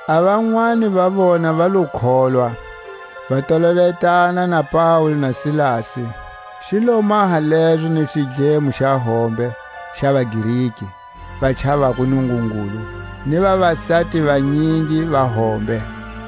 A vanwani va vona va lo kholwa, va tolovetana na Paule na Silasi; xi lo maha lezo ni xidlemo xa hombe xa vaGreki va chavako Nungungulu, ni vavasati vanyingi va hombe.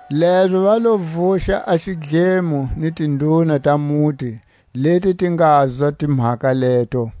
Lezo va lo vuxa a xidlemo ni tinduna ta muti leti ti ngazwa timhaka leto.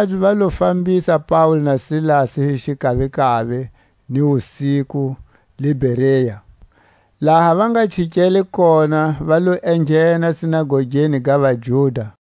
A vamakabye va lo fambisa Paule na Silasi hi xikavikavi ni wusiku le Berea; laha va nga chikele kona va lo enghena sinagogeni ga vaJuda.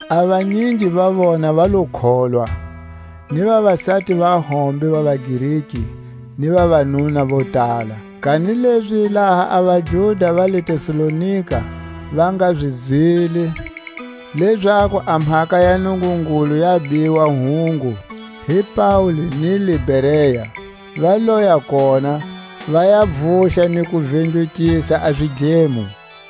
A vanyingi va vona va lo kholwa; ni vavasati va hombe va vaGreki, ni vavanuna vo tala. Kanilezi laha a vaJuda va le Tesalonika va nga zi zwile, lezaku a mhaka ya Nungungulu ya biwa hungu hi Paule ni le Berea, va loya kona, va ya Vuxa ni ku vindlukisa a zidlemo.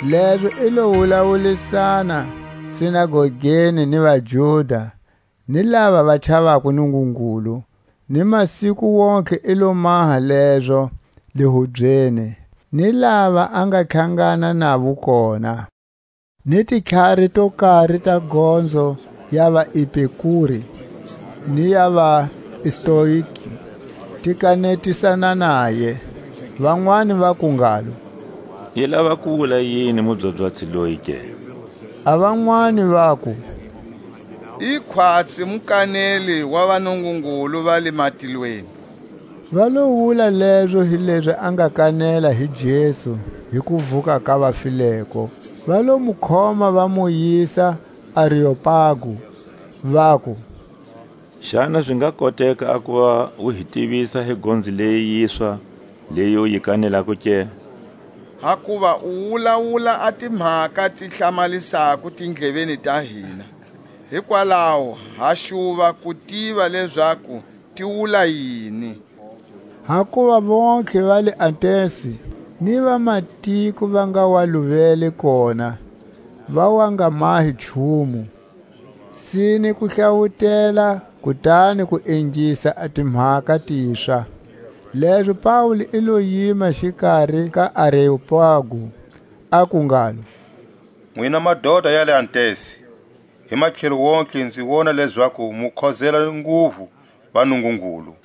Lezo i lo wulawulisana sinagogeni ni vaJuda hi lava va chavako Nungungulu; ni masiku wontihe i lo maha lezo le hubyeni ni lava a nga tlhangana navo kona. Ni titlhari to kari ta gonzo ya vaEpikure ni ya vaStoike ti kanetisana naye. Vanwani vaku ngalo: I lava ku wula yini a mubyabyatsi loyi ke? A vanwani vaku: I khwatsi mukaneli wa vanungungulu va le matikweni. Va lo wula lezo hilezi a nga kanela hi Jesu ni kuvuka ka vafileko. Va lo mu khoma, va mu yisa Areopagu, vaku: Xana zi nga koteka a kuva u hi tivisa hi gonzo leyi yiswa, leyi u yi kanelako ke? Hakuva u wulawula a timhaka ti hlamalisako tindleveni ta hina; hikwalaho ha xuva ku tiva lezaku ti wula yini. Hakuva vontlhe va le Atensi, ni vamatiko va nga wa luvele kona, va wa nga mahi nchumu, sine ku hlawutela kutani ku ingisa a timhaka tiswa. Lezo Paule i lo yima xikari ka Areopagu, aku ngalo: Nwina madota ya le Atensi, hi matlhelo wontihe nzi wona lezaku mu khozela nguvu vanungungulu.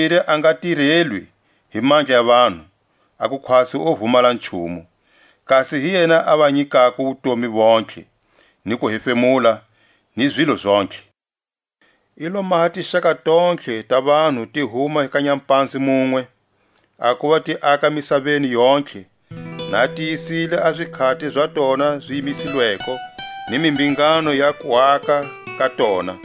Tlhatakumbiri a nga tirelwi hi mandla ya vanhu, a ku khwatsi o vumala nchumu; kasi hi yena a va nyikako wutomi vontlhe, ni kuhefemula, ni zilo Zontlhe. I lo maha tixaka tontlhe ta vanhu ti huma ka nyapanze munwe, a kuva ti aka misaveni yontlhe; na a tiyisile a zikhati za tona zi yimisilweko, ni mimbhingano ya kuaka ka tona;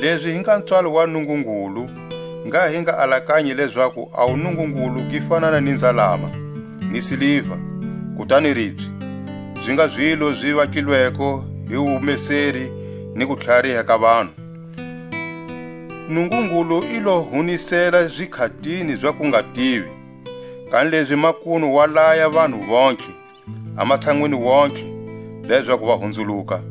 Lezi hi nga pswalo wa Nungungulu, ngha hi nga alakanyi lezaku a wuNungungulu gi fanana ni nzalama, ni siliva, kutani ribye, zi nga zilo zi vatlilweko hi wumeseri ni kutlhariha ka vanhu. Nungungulu i lo hunisela zikhati za kungativi; kanilezi makunu wa laya vanhu vontlhe, a matshanwini wontihe, lezaku va hunzuluka.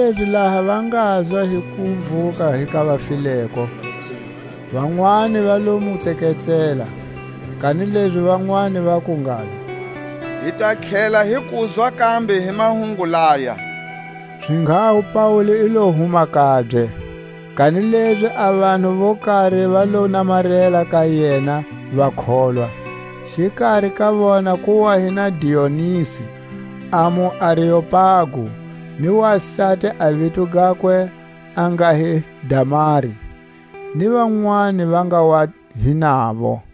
Kanilezi laha va ngazwa hi kuvuka hi ka vafileko, vanwani va lo mu tseketsela; kanilezi vanwani vaku ngalo: Hi ta tlhela hi kuzwa kambe hi mahungu laya. Zinghaho Paule i lo huma kabye. Kanilezi a vanhu vo kari va lo namarela ka yena, va kholwa; xikari ka vona ku wa hi na Dionisi a muAreopagu, ni wasati a vito gakwe a nga hi Damari, ni vanwani va nga wa hi navo.